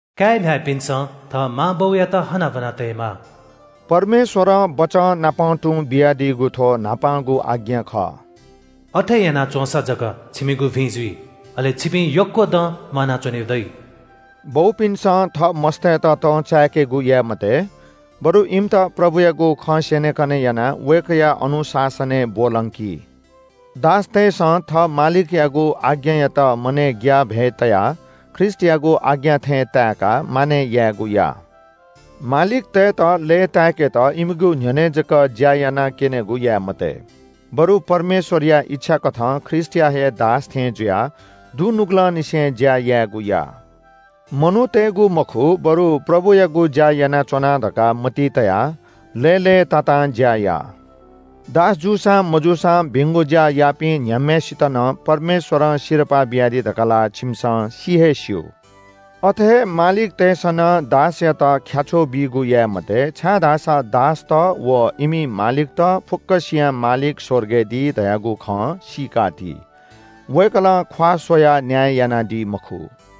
“काय् म्‍ह्याय्‌पिन्‍सं थः मां बौयात हनाबना तयेमाः” – परमेश्‍वरं बचंनापं तुं बियादीगु थ्‍व न्‍हापांगु आज्ञा खः। “अथे याना च्‍वंसा जक छिमिगु भिं जुइ, अले छिपिं यक्‍व दँ म्‍वानाच्‍वने दइ।” बौपिन्‍सं थः मस्‍तय्‌त तंचाय्‌केगु याये मते, बरु इमित प्रभुयागु खँ स्‍यनेकने यानाः वय्‌कःया अनुशासनय् ब्‍वलंकी। दासतय्‌सं थः मालिकयागु आज्ञायात मनय् ग्‍याःभय तयाः ख्रीष्‍टयागु आज्ञा थें ताय्‌काः मानय् यायेगु या। मालिकतय्‌त लय्‌ताय्‌केत इमिगु न्‍ह्यःने जक ज्‍या याना क्‍यनेगु याये मते, बरु परमेश्‍वरया इच्‍छा कथं ख्रीष्‍टया हे दास थें जुयाः दुनुगलंनिसें ज्‍या यायेगु या। मनूतय्‌गु मखु, बरु प्रभुयागु ज्‍या यानाच्‍वना धकाः मतिइ तयाः लय्‌लय्‌तातां ज्‍या या। दास जूसां मजूसां भिंगु ज्‍या याःपिं न्‍ह्याम्‍हय्‌सित नं परमेश्‍वरं सिरपाः बियादी धकाः ला छिमिसं सि हे स्‍यू। अथे हे मालिकतय्‌सं नं दासयात ख्‍याच्‍वः बीगु याये मते, छाय्‌धाःसा दासत व इमि मालिकत फुक्‍कसियां मालिक स्‍वर्गय् दी धयागु खँ सीकाति। वय्‌कलं ख्‍वाः स्‍वयाः न्‍याय यानादी मखु।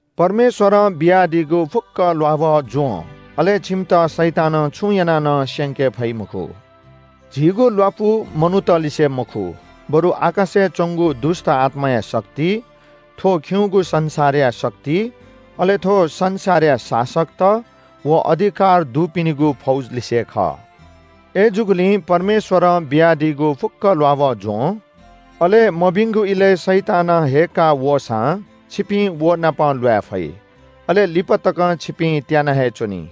परमेश्‍वरं बियादीगु फुक्‍क ल्‍वाभः ज्‍वँ। अले छिमित शैतानं छुं यानाः नं स्‍यंके फइ मखु। झीगु ल्‍वापु मनूतलिसे मखु। बरु आकाशय् च्‍वंगु दुष्‍ट आत्‍माया शक्ति, थ्‍व खिउँगु संसारया शक्ति अले थ्‍व संसारया शासकत व अधिकार दुपिनिगु फौज लिसे खः। अय्‌जूगुलिं परमेश्‍वरं बियादीगु फुक्‍क ल्‍वाभः ज्‍वँ। अले मभिंगु इलय् शैतानं हय्‌क्‍काः वःसां छिपिं व नाप ल्‍वाये फइ। अले लिपा तकं छिपिं त्‍याना हे च्‍वनी।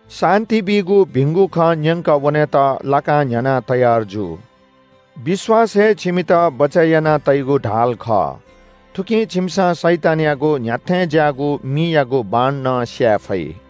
शान्‍ति बीगु भिंगु खँ न्‍यंकः वनेत लाकां न्‍ह्यानाः तयार जु। विश्‍वास हे छिमित बचय् याना तइगु ढाल खः। थुकिं छिमिसं शैतानयागु न्‍ह्याथें ज्‍याःगु मियागु वाण नं स्‍याये फइ।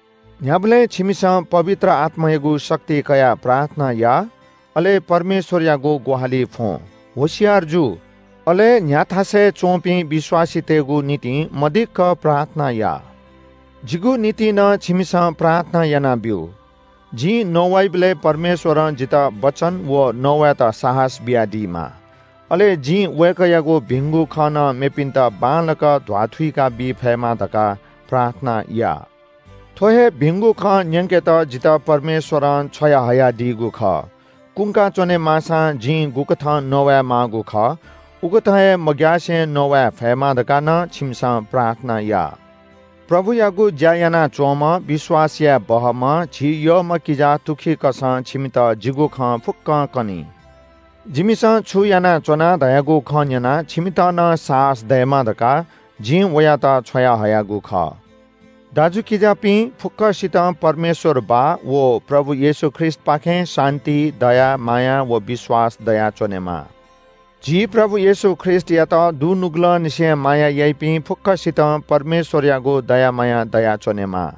न्‍ह्याबलें छिमिसं पवित्र आत्‍मायागु शक्ति कयाः प्रार्थना या, अले परमेश्‍वरयागु ग्‍वाहालि फ्‍वँ। होशियार जु, अले न्‍ह्याथासय् च्‍वंपिं विश्‍वासीतय्‌गु निंतिं मदिक्‍क प्रार्थना या। जिगु निंतिं नं छिमिसं प्रार्थना यानाब्‍यु। जिं नवाइबलय् परमेश्‍वरं जितः वचन व नवायेत साहस बियादीमा, अले जिं वय्‌कःयागु भिंगु खँ नं मेपिन्‍त बांलाक ध्‍वाथुइका बी फयेमा धकाः प्रार्थना या। थ्‍व हे भिंगु खँ न्‍यंकेत जितः परमेश्‍वरं छ्वयाहयादीगु खः। कुंका च्‍वनेमाःसां जिं गुकथं नवाये माःगु खः उकथं हे मग्‍यासे नवाये फयेमा धकाः नं छिमिसं प्रार्थना या। प्रभुयागु ज्‍या यानाच्‍वंम्‍ह विश्‍वास याये बहःम्‍ह झी यःम्‍ह किजा तुखिकसं छिमित जिगु खँ फुक्‍कं कनी। जिमिसं छु यानाच्‍वना धयागु खँ न्‍यनाः छिमित नं साहस दयेमा धकाः जिं वयात छ्वयाहयागु खः। दाजुकिजापिं, फुक्‍कसितं परमेश्‍वर बाः व प्रभु येशू ख्रीष्‍टपाखें शान्‍ति, दया माया व विश्‍वास दयाच्‍वनेमा। झी प्रभु येशू ख्रीष्‍टयात दुनुगलंनिसें माया याइपिं फुक्‍कसितं परमेश्‍वरयागु दया माया दयाच्‍वनेमा।